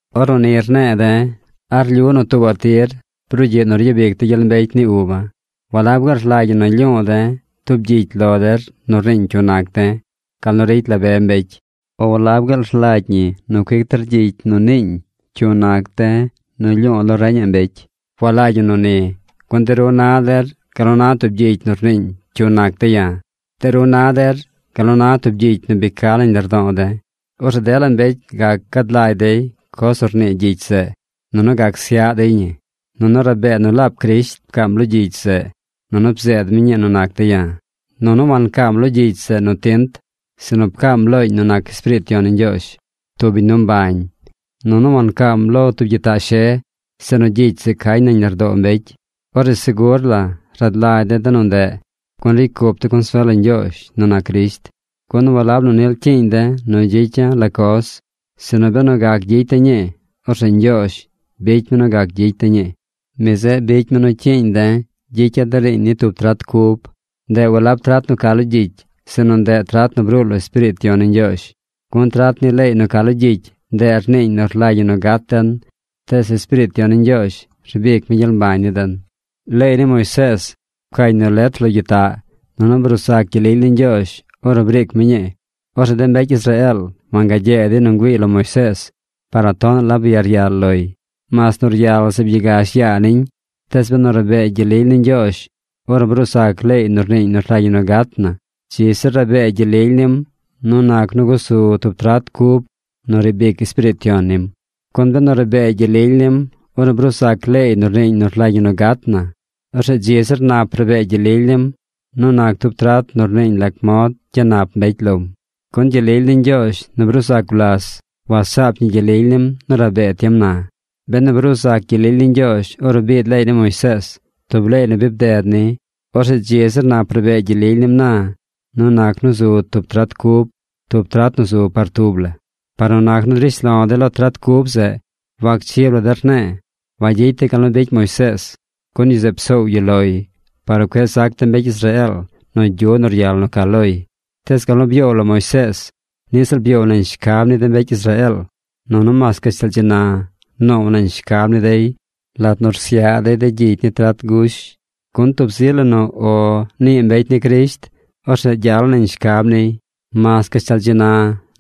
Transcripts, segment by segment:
Ornu ni rne̱e̱ de̱, ¿a rlyu nu tuubaꞌ tir brugyiꞌ nu ryabic de̱ gyel mbecy ni uba̱? ¿Walab gaal rlagy ñi nu rlyu̱u̱ de̱ tub gyicy lo der nu rniiñ cyu nac de̱, gal nu ricy la be mbecy? ¿O walab gaal rlagy ñi nu cuic der gyicy nu rnii cyu nac de̱ nu lyu̱u̱ lo reñaꞌ mbecy? Walagy ñi nu ni, gun de ru na der gal nu na tub gyicy nu rniiñ cyu nac de̱ ya̱. De ru na der gal nu na tub gyicy nu bi ca nañ lardo̱o̱ de̱. Orzeꞌ dela mbecy gac gad lagy dey coz nu rnii gyicy zeꞌ, nunu gac syaꞌ dey ñi. Nunu rabee nu laab Crisht pcaam lo gyicy zeꞌ, nunu bzeed mi ñii nu nac de̱ ya̱. Nunu wancaam lo gyicy zeꞌ nu tint, sinu pcaam looñ nu nac Espiriit Yon ni Ñgyoozh, tub biñ nu mbañ. Nunu wancañ lo tub gyitaꞌ she, sinu gyicy zeꞌ cañ nañ lardoo mbecy. Orzeꞌ segur la rad lagy de̱ de nu ndeꞌ, gun ricy cup de̱ consuel lo Ñgyoozh nu nac Crisht. Gun walab nu nil cyiiñ de̱ nu gyicya̱ la coz, sinu benu gac gyicy de̱ ñii, orzeꞌ Ñgyoozh bicy mi nu gac gyicy de̱ ñii. Mi zeꞌ bicy mi nu cyiiñ de̱ gyicya̱ de riiñ ni tub trat cub. Ndeꞌ walab trat nu ca lo gyicy. Sinu ndeꞌ trat nu bruu lo Espiriit Yon ni Ñgyoozh. Gun trat ni leey nu ca lo gyicy, ndeꞌ rniiñ nu rlagy ñi nu gat den. Tees Espiriit Yon ni Ñgyoozh rbic mi gyel mbañ ni den. Leey ni Moisees pcañ nu letr lo gyitaꞌ. Nunu bruu zac gyel lily ni Ñgyoozh, ornu briic mi ñii. Orzeꞌ de mbecy Israeel wangagyee dey nu ngüiiy lo Moisees par nu tonaꞌ la byaryal loy, mas nu ryal zeꞌ byagash yaa niñ. Tees benu rabee gyel lily ni Ñgyoozh ornu bruu zac leey nu rniiñ nu rlagy ñi nu gat na, ¡dzi zir rabee gyel lily nim nu nac nu gusu tub trat cub nu riib ic Espiriit Yon nim! Gun benu rabee gyel lily nim ornu bruu zac leey nu rñii nu rlagy ñi nu gat na, ¡orzeꞌ dzi zir nap rabee gyel lily nim nu nac tub trat nu rniiñ lac mod gyanap mbecy lom! Gun gyel lily ni Ñgyoozh nu bruu zac gulas wasaap ñi gyel lily nim nu rabee tiem na. Benu bruu zac gyel lily ni Ñgyoozh ornu biid leey ni Moisees, tub leey nu bi bded ni, orzeꞌ dzi zir nap rabee gyel lily nim na nu nac nu zu tub trat cub, tub trat nu zu par tub la. Par nu nac nu drish lo̱ de̱ lo trat cub zeꞌ, wacchib la de̱ rne̱e̱. Wagyicy de̱ gal nu bicy Moisees. Gun yu zeꞌ psoow yu loy par nu cueꞌ zac de mbecy Israeel nu gyu nu ryal nu ca loy. Tees gal nu byoow lo Moisees, niꞌ ziꞌl byoow nañ shcab ni de mbecy Israeel. Nunu mas gashtal dzi na noow nañ shcab ni dey lat nu rsyaꞌ dey de gyicy ni trat gush. Gun tub zi la nu “O” nii mbecy ni Crisht, orzeꞌ gyal nañ shcab niy. Mas gashtal dzi na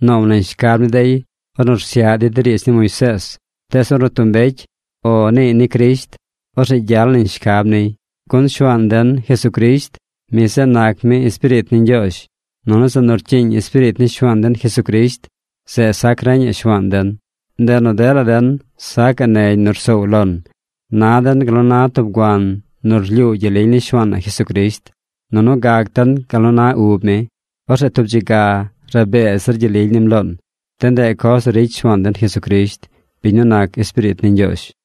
noow nañ shcab ni dey ornu rsyaꞌ dey de riidz ni Moisees. Tees ornu tub mbecy “O” niiy ni Crisht, orzeꞌ gyal nañ shcab niy. Gun Shuaan den, Jesucrisht, mi zeꞌ nac mi Espiriit ni Ñgyoozh. Nunu zeꞌ nu rcyiiñ Espiriit ni Shuaan den Jesucrisht, zeꞌ sac reñaꞌ shuaan den. Ndeꞌ nu dela den sacaꞌ negy nu rsoow lon. Na den gal nu na tub guan nu rlyuu gyel lily ni Shuaan na Jesucrisht. Nunu gac den gal nu na ub mi. Orzeꞌ tub dzi ga rabee zir gyel lily nim loon. De ndeꞌ coz nu ricy Shuaan den Jesucrisht, biñ nu nac Espiriit ni Ñgyoozh.